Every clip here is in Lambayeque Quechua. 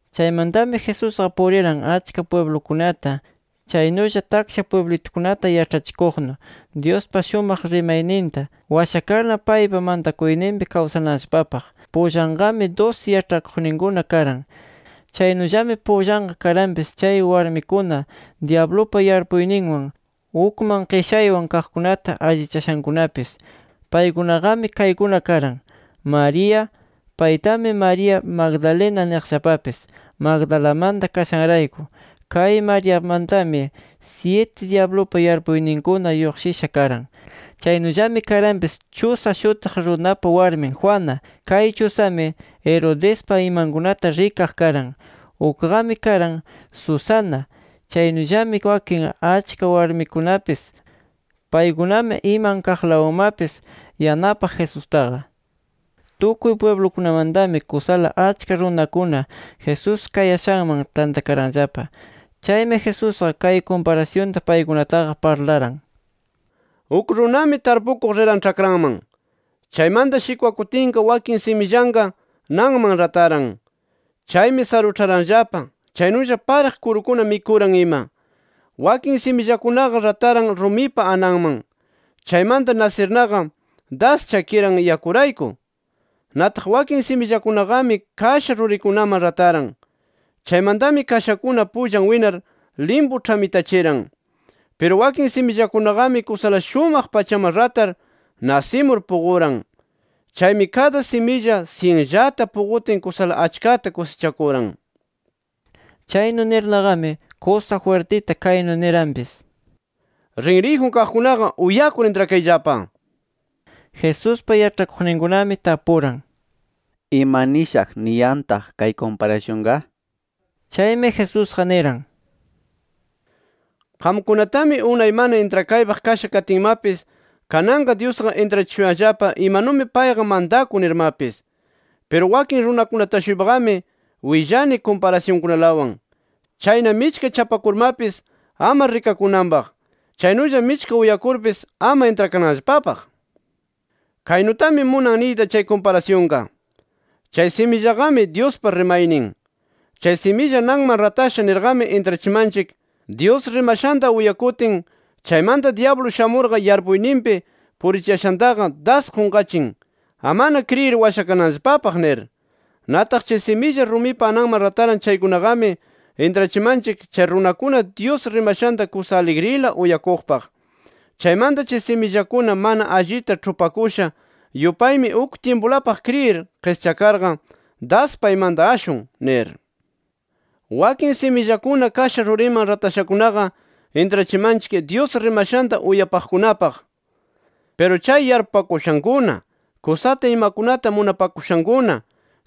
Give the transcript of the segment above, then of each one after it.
Chaymantami, Jesusqa puriran achka pwiblukunata, chaynulla taksha pwiblitukunata, yaĉhachikuqnu Dyuspa shumaq rimayninta washakarna paypa mantakuyninpi kawsananllapapaq. Pullanqami dusi yaĉhakuqninkuna karan. Chaynullami pullanqa karanpis chay warmikuna, dyablupa yarpuyninwan, ukman qishaywan kaqkunata allichashankunapis. Paykunaqami kaykuna karan: María. Paytami María Magdalena niqllapapis, Magdalamanta kashanrayku. Kay Mariamantami, syiti dyablupa yarpuyninkuna lluqshisha karan. Chaynullami karanpis Chuza shutiq runapa warmin Juana. Kay Chuzami, Herodespa imankunata rikaq karan. Ukqami karan Susana; chaynullami wakin achka warmikunapis. Paykunami iman kaqlawanmapis yanapaq Jesustaqa. Tukuy pwiblukunamantami kusala achka runakuna Jesús kayashanman tantakaranllapa. Chaymi Jesusqa kay kumparasyunta paykunataqa parlaran: “Uk runami tarpukuq riran ĉhakranman. Chaymanta shikwakutinqa wakin simillanqa nanman rataran. Chaymi saruĉharanllapa, chaynulla pariq kurukuna mikuran ima. Wakin simillakunaqa rataran rumipa ananman. Chaymanta nasirnaqa, das chakiran yakurayku. Nataq wakin simillakunaqami kasha rurikunaman rataran. Chaymantami kashakuna pullan winar, limpu ĉhamitachiran. Piru wakin simillakunaqami kusala shumaq pachaman ratar, nasimur puquran. Chaymi kada similla syinllata puqutin kusala achkata kusichakuran”. Chaynu nirnaqami, kusa jwirtita kaynu niranpis: “Rinriyjun kaqkunaqa uyakur intrakayllapa” nir. Jesuspa yaĉhakuqninkunami tapuran: —¿Ima nishaq niyantaq kay kumparasyunqa? nir. Chaymi Jesusqa niran: —Qamkunatami unay mana intrakaypaq kasha katinmapis, kananqa Dyusqa intrachishuyanllapa imanumi payqa mantakun nirmapis. Piru wakin runakunata-shuypaqami willani kumparasyunkunalawan. Chayna michka chapakurmapis ama rikakunanpaq, chaynulla michka uyakurpis ama intrakananllapapaq. “Kaynutami munan niyta chay kumparasyunqa: Chay simillaqami, Dyuspa rimaynin. “Chay similla nanman ratasha nirqami intrachimanchik, Dyus rimashanta uyakutin chaymanta dyablu shamurqa yarpuyninpi purichiyashanta das qunqachin, amana kriyir washakananllapapaq nir. “Nataq chay similla rumipa ananman rataran chaykunaqami, intrachimanchik chay runakuna Dyus rimashanta kusa aligrila uyakuqpaq. Chaymanta chay simillakuna mana allita ĉhupakusha yupaymi uk tyimpulapaq kriyir qischakarqa das paymanta ashun nir. “Wakin simillakuna kasha ruriman ratashakunaqa, intrachimanchik Dyus rimashanta uyapaqkunapaq. Piru chay yarpupakushankuna, kusata imakunata munapashankuna,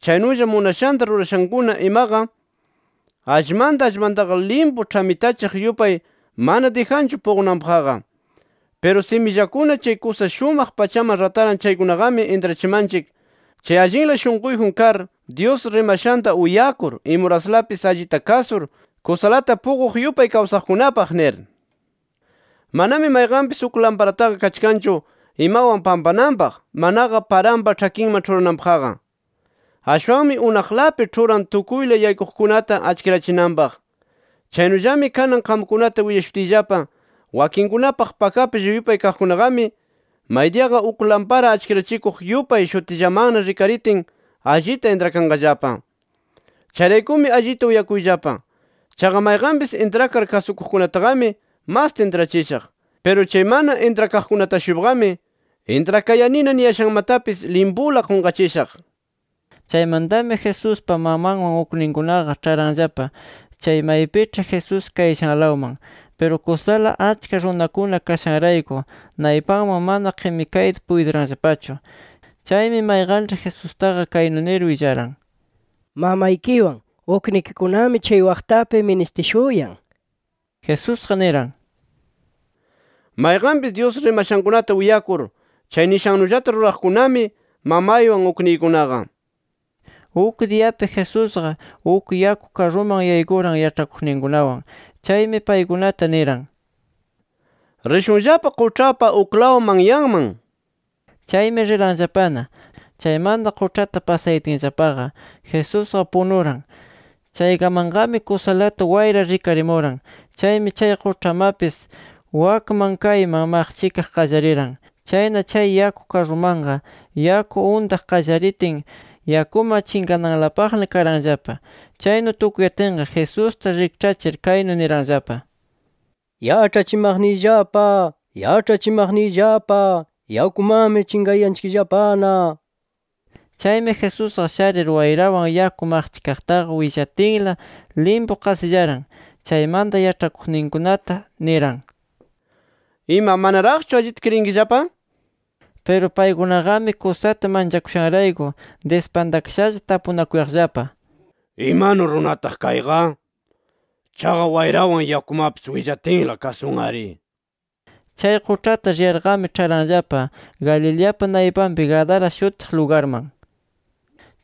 chaynulla munashanta rurashankuna imaqa, allmanta allmantaqa limpu ĉhamitachiq yupay mana dijanchu puqunanpaqqa. “Piru simillakuna chay kusa shumaq pachaman rataran chaykunaqami intrachimanchik, chay allinla shunquyjun kar Dyus rimashanta uyakur imuraslapis allita kasur, kusalata puquq yupay kawsaqkunapaq nir. “Manami mayqanpis uk lamparataqa kachkanchu imawan pampananpaq manaqa paranpa ĉhakinman ĉhurananpaqqa. Ashwanmi unaqlapi ĉhuran tukuyla yaykuqkunata achkirachinanpaq. Chaynullami kanan qamkunata willashutiyllapa wakinkunapaq pakaplla yupay kaqkunaqami, maydiyaqa uk lampara achkirachikuq yupay shutillamanna rikaritin allita intrakanqallapa. “Chayraykumi allita uyakuyllapa: Chaqa mayqanpis intrakar kasukuqkunataqami masta intrachishaq. Piru chay mana intrakaqkunata-shuypaqami intrakayanina niyashanmatapis limpula qunqachishaq”. Chaymantami Jesuspa mamanwan ukninkunaqa, ĉharanllapa chay maypiĉhi Jesús kayashanlawman. Piru kusala achka runakuna kashanrayku naypanman mana qimikayta puytiranllapachu. Chaymi mayqanĉhi Jesustaqa kaynu nir willaran: —Mamaykiwan uknikikunami chay waqtapi ministishuyan nir. Jesusqa niran: —Mayqanpis Dyus rimashankunata uyakur, chay nishannullata ruraqkunami, mamaywan ukniykunaqa nir. Uk diyapi, Jesusqa uk yaku karruman yaykuran yaĉhakuqninkunawan. Chaymi paykunata niran: —Rishunllapa quĉhapa uklaw manyanman nir. Chaymi riranllapana. Chaymanta quĉhata pasayatinllapaqa, Jesusqa punuran. Chaykamanqami, kusalata wayra rikarimuran. Chaymi chay quĉhamapis wakmanta kaymanta maqchikaq qallariran. Chayna, chay yaku karrumanqa yaku untaq qallaritin, yakuman chinqananlapaqna karanllapa. Chaynu tukuyatinqa, Jesusta rikĉhachir kaynu niranllapa: —¡Yaĉhachimaqniyllapa! ¡Yaĉhachimaqniyllapa! ¡Yakumanmi chinqayanchikllapana! nir. Chaymi Jesusqa sharir, wayrawan yaku maqchikaqtaqa willatinla, limpu qasillaran. Chaymanta yaĉhakuqninkunata niran: —Ima, ¿manaraqchu allita kriyinkillapa? nir. Piru paykunaqami kusata manchakushanrayku dispantakashalla, tapunakuyaqllapa: “¿Imanu runataq kayqa? Chaqa wayrawan yakumatapis willatinla, kasun-ari” nir. Chay quĉhata riyarqami, ĉharanllapa Galileapa naypanpi Gadara shutiq lugarman.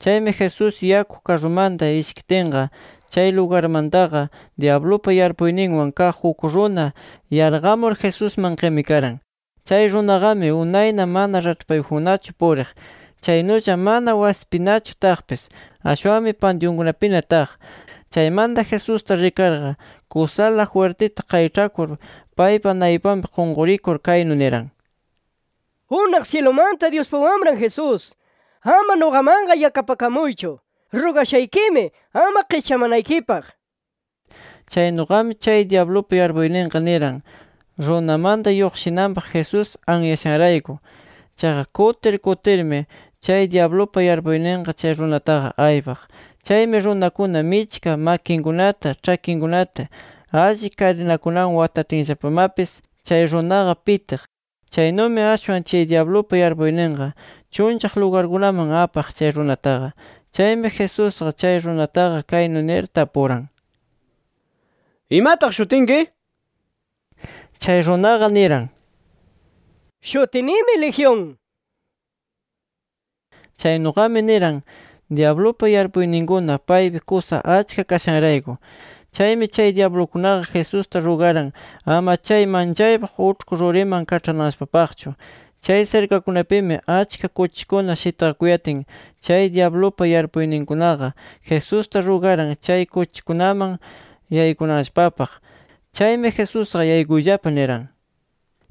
Chaymi, Jesús yaku karrumanta ishkitinqa, chay lugarmantaqa dyablupa yarpuyninwan kaq uk runa yarqamur Jesusman qimikaran. Chay runaqami unayna mana raĉhpayjunnachu puriq, chaynulla mana wasipinachu taqpis. Ashwanmi pantyunkunapina taq. Chaymanta Jesusta rikarqa, kusala jwirtita qayĉhakur paypa naypanpi qunqurir kaynu niran: —¡Unaq syilumanta Dyuspa Wamran Jesús, ama nuqamanqa yakapakamuychu! ¡Rugashaykimi ama qischamanaykipaq! nir. Chaynuqami chay dyablupa yarpuyninqa niran, runamanta lluqshinanpaq Jesús anyashanrayku. Chaqa kutir kutirmi chay dyablupa yarpuyninqa chay runataqa aypaq. Chaymi runakuna michka makinkunata, ĉhakinkunata alli kadinakunawan watatinllapamapis chay runaqa pitiq. Chaynumi ashwan chay dyablupa yarpuyninqa chunllaq lugarkunaman apaq chay runataqa. Chaymi Jesusqa chay runataqa kaynu nir tapuran: —¿Imataq shutinki? Chay runaqa niran: —Shutinimi ‘Legión’. Chaynuqami niran, dyablupa yarpuyninkuna paypi kusa achka kashanrayku. Chaymi chay dyablukunaqa, Jesusta rugaran ama chay manchaypaq uĉhku ruriman kaĉhananllapapaqchu. Chay sirkakunapimi achka kuchikuna shitqakuyatin, chay dyablupa yarpuyninkunaqa Jesusta rugaran, chay kuchikunaman yaykunanllapapaq. Chaymi Jesusqa yaykuyllapa niran.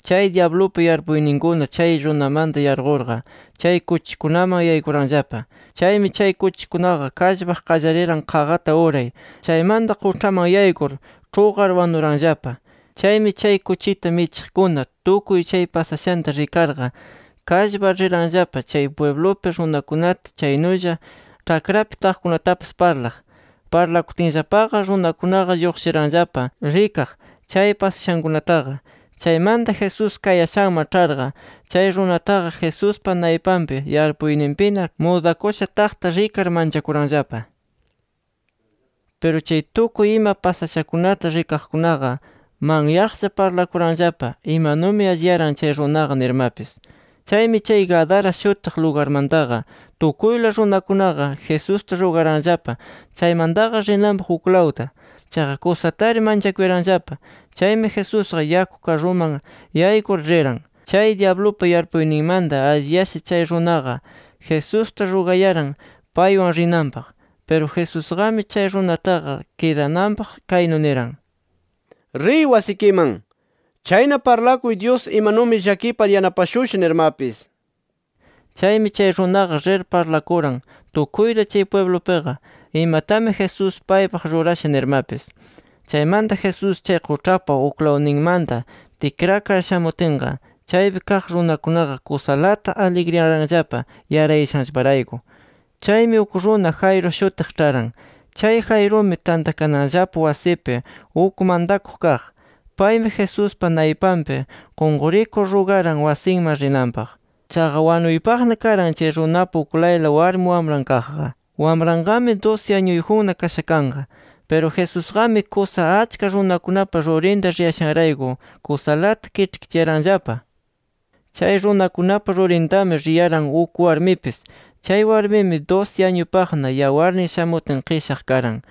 Chay dyablupa yarpuyninkuna chay runamanta yarqurqa, chay kuchikunaman yaykuranllapa. Chaymi chay kuchikunaqa kallpaq qallariran qaqata uray. Chaymanta quĉhaman yaykur ĉhuqar wanuranllapa. Chaymi chay kuchita michiqkuna, tukuy chay pasashanta rikarqa, kallpar riranllapa chay pwiblupi runakunata, chaynulla ĉhakrapi taqkunatapis parlaq. Parlakutinllapaqa runakunaqa lluqshiranllapa rikaq chay pasashankunataqa. Chaymanta Jesús kayashanman ĉharqa, chay runataqa Jesuspa naypanpi yarpuyninpina, mudakusha taqta rikar manchakuranllapa. Piru chay tukuy ima pasashakunata rikaqkunaqa, manyaqlla parlakuranllapa imanumi alliyaran chay runaqa nirmapis. Chaymi chay Gadara shutiq lugarmantaqa, tukuyla runakunaqa Jesusta rugaranllapa, chaymantaqa rinanpaq uklawta. Chaqa kusatari manchakuyaranllapa. Chaymi Jesusqa yaku karruman yaykur riran. Chay dyablupa yarpuyninmanta alliyasha chay runaqa, Jesusta rugayaran paywan rinanpaq. Piru Jesusqami chay runataqa kidananpaq kaynu niran: —Riy wasikiman. Chayna parlakuy Dyus imanumi llakipar yanapashusha nirmapis. Chaymi chay runaqa rir parlakuran tukuyta chay pwiblupiqa, imatami Jesús paypaq rurasha nirmapis. Chaymanta Jesús chay quĉhapa uklawninmanta tikrakar shamutinqa, chaypi kaq runakunaqa kusalata aligriyaranllapa yarayashanllaparayku. Chaymi, uk runa Jairo shutiq ĉharan. Chay Jairumi tantakananllapa wasipi uk mantakuq kaq. Paymi Jesuspa naypanpi qunqurikur rugaran wasinman rinanpaq. Chaqa wanuypaqna karan chay runapa uklayla warmi wamran kaqqa. Wamranqami dusi añuyjunna kasha kanqa. Piru Jesusqami kusa achka runakunapa rurinta riyashanrayku, kusalata kiĉhkichiyaranllapa. Chay runakunapa rurintami riyaran uk warmipis. Chay warmimi dusi añupaqna yawarnin shamutin qishaq karan.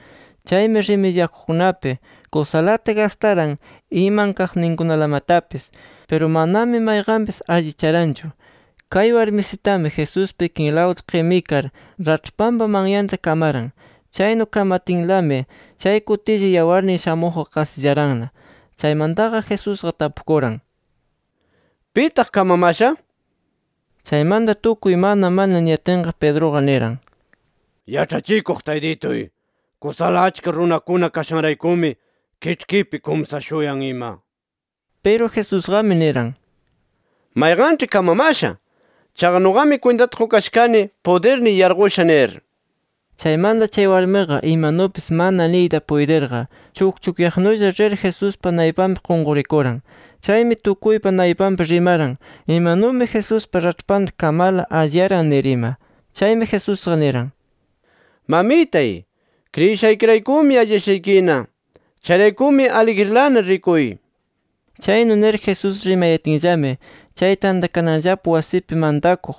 Chaymi rimidyakuqkunapi, kusalata gastaran iman kaqninkunalamatapis. Piru manami mayqanpis allicharanchu. Kay warmisitami Jesuspa ikinlawta qimikar raĉhpanpa manyanta kamaran. Chaynu kamatinlami, chay kutilla yawarnin shamuqqa qasillaranna. Chaymantaqa Jesusqa tapukuran: —¿Pitaq kamamasha? nir. Chaymanta tukuy “Mana mana” niyatinqa, Pedruqa niran: —Yaĉhachikuq Taytituy, kusala achka runakuna kashanraykumi, kiĉhkipi kumsashuyan ima nir. Piru Jesusqami niran: —Mayqanĉhi kamamasha. Chaqa nuqami kwintata qukasha kani, pudirniy yarqusha nir. Chaymanta chay warmiqa imanupis mana niyta puytirqa, chukchukyaqnulla rir Jesuspa naypanpi qunqurikuran. Chaymi tukuypa naypanpi rimaran imanumi Jesuspa raĉhpanta kamarla alliyaran nir ima. Chaymi Jesusqa niran: —Mamitay, kriyishaykiraykumi alliyashaykina. Chayraykumi aligrilana rikuy. Chaynu nir Jesús rimayatinllami, chay tantakananllapa wasipi mantakuq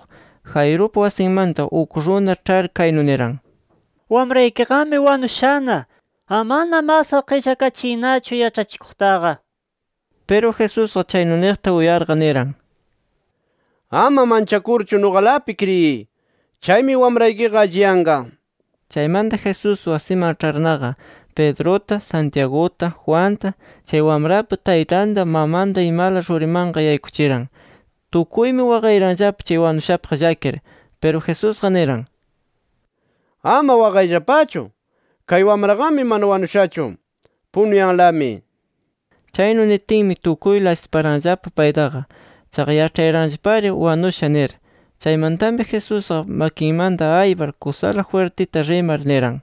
Jairupa wasinmanta uk runa ĉhar kaynu niran: —Wamraykiqami wanushana. Amana masqa qillakachiynachu yaĉhachikuqtaqa nir. Piru Jesusqa chaynu niqta uyarqa, niran: —Ama manchakurchu, nuqalapi kriyiy. Chaymi wamraykiqa alliyanqa nir. Chaymanta Jesús wasiman ĉharnaqa, Pedruta, Santiaguta, Juanta, chay wamrapa taytanta, mamanta imala rurimanqa yaykuchiran. Tukuymi waqayaranllapa chay wanushapaq llakir. Piru Jesusqa niran: —Ama waqayllapachu. Kay wamraqami mana wanushachu, punuyanlami nir. Chaynu nitinmi, tukuyla asiparanllapa paytaqa. Chaqa yaĉhayaranllapari wanusha nir. Chaymantami Jesusqa makinmanta aypar kusala jwirtita rimar niran: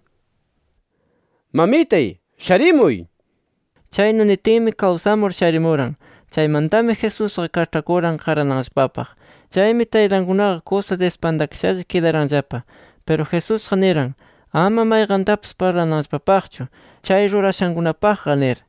—¡Mamitay sharimuy! nir. Chaynu nitinmi kawsamur, sharimuran. Chaymantami Jesusqa kaĉhakuran qarananllapapaq. Chaymi taytankunaqa, kusa dispantakashalla kidaranllapa. Piru Jesusqa niran, ama mayqantapis parlananllapapaqchu, chay rurashankunapaqqa nir.